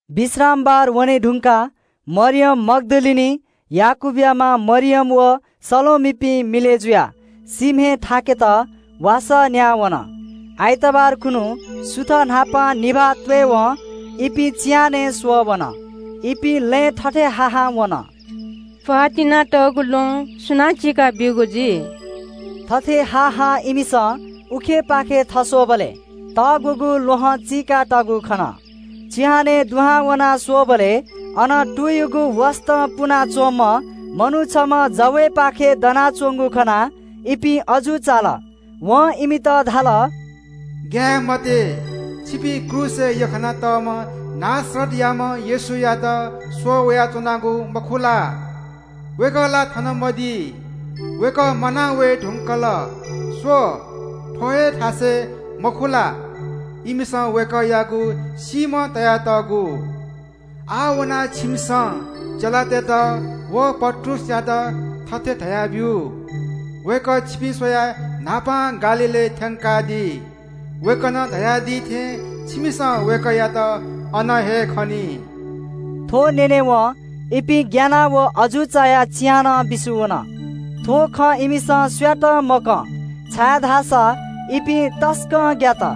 विश्रामबार वने धुंकाः मरियम मग्‍दलिनी, याकूबया मां मरियम व सलोमीपिं मिलय् जुयाः सीम्‍हय् इलेत वासः न्‍याः वन। आइतबार खुन्‍हु, सुथ न्‍हापां निभाः त्‍वयेवं इपिं चिहानय् स्‍वःवन। इपिं लँय् थथे हा हां वन – “प्‍वाः तिनातःगु ल्‍वहं सुनां चीका बीगु जुइ?” थथे हा हां इमिसं उखेपाखे थस्‍वःबलय् तग्‍वःगु ल्‍वहं चीकातःगु खन। चिहानय् दुहां वनाः स्‍वःबलय् अन तुयुगु वसतं पुना च्‍वंम्‍ह मनू छम्‍ह जवय्‌पाखे दनाच्‍वंगु खनाः इपिं अजू चाल। वं इमित धाल – “ग्‍याये मते। छिपिं क्रूसय् यख्‍खानातःम्‍ह नासरतयाम्‍ह येशूयात स्‍वःवयाच्‍वनागु मखु ला? वय्‌कः ला थन मदी। वय्‌कः म्‍वाना वये धुंकल। स्‍व, थ्‍व हे थासय् मखु ला, इमिसं वय्‌कःयागु सीम्‍ह तयातःगु? आः वनाः छिमिसं चेलातय्‌त व पत्रुसयात थथे धयाब्‍यु – ‘वय्‌कः छिपिं स्‍वयाः न्‍हापां गालीलय् थ्‍यंकादी। वय्‌कलं धयादी थें छिमिसं वय्‌कःयात अन हे खनी।’” थ्‍व न्‍यनेवं इपिं ग्‍यानाः व अजू चायाः चिहानं बिस्‍युं वन। थ्‍व खँ इमिसं सुयातं मकं, छाय्‌धाःसा इपिं तसकं ग्‍यात।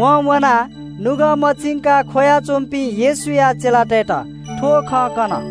वं वनाः नुगः मछिंकाः ख्‍वया च्‍वंपिं येशूया चेलातय्‌त थ्‍व खँ कन।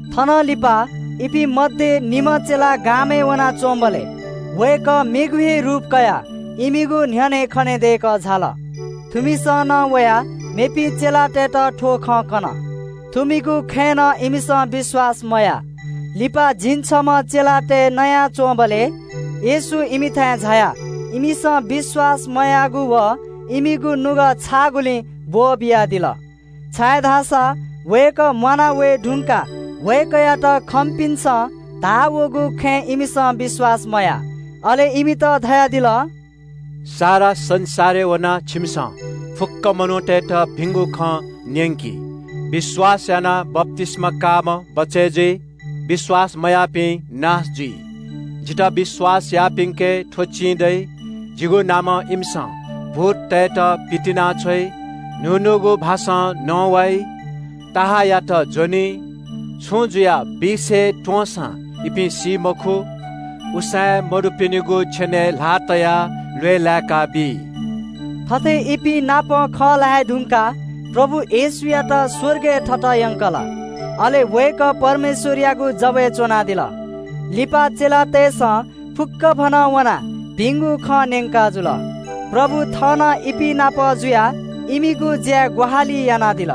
थनंलिपा इपिं मध्‍ये निम्‍ह चेला गामय् वनाच्‍वंबलय् वय्‌कः मेगु हे रूप कयाः इमिगु न्‍ह्यःने खनेदय्‌कः झाल। थुमिसं नं वयाः मेपिं चेलातय्‌त थ्‍व खँ कन। थुमिगु खँय् नं इमिसं विश्‍वास मयाः। लिपा झिंछम्‍ह चेलातय् नयाच्‍वंबलय् येशू इमिथाय् झायाः इमिसं विश्‍वास मयाःगु व इमिगु नुगः छाःगुलिं ब्‍वःबियादिल, छाय्‌धाःसा वय्‌कः म्‍वाना झाये धुंकाः वय्‌कःयात खंपिन्‍सं धाः वःगु खँय् इमिसं विश्‍वास मयाः। अले इमित धयादिल – “सारा संसारय् वनाः छिमिसं फुक्‍क मनूतय्‌त भिंगु खँ न्‍यंकि। विश्‍वास यानाः बप्‍तिस्‍मा काःम्‍ह बचय् जुइ, विश्‍वास मयाःपिं दोषी ठहरय् जुइ। जितः विश्‍वास याःपिन्‍के थ्‍व चिं दइ – जिगु नामं इमिसं भूततय्‌त पितिनाछ्वइ, न्‍हू न्‍हूगु भाषां नवाइ, सर्पयात ज्‍वनी, छुं जुयाः बिख हे त्‍वंसां इपिं सी मखु, उसाँय् मदुपिनिगु छेनय् ल्‍हाः तयाः ल्‍वय् लाय्‌काबी।” थथे इपिं नाप खँ ल्‍हाये धुंकाः प्रभु येशूयात स्‍वर्गय् थत यंकल। अले वय्‌कः परमेश्‍वरयागु जवय् च्‍वनादिल। लिपा चेलातय्‌सं फुक्‍कभनं वनाः भिंगु खँ न्‍यंकाजुल। प्रभु थः नं इपिं नाप जुयाः इमिगु ज्‍याय् ग्‍वाहालि यानादिल।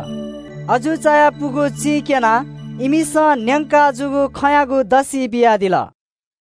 अजू चायापुगु चिं क्‍यनाः इमिसं न्‍यंकाजूगु खँयागु दसि बियादिल। आमेन।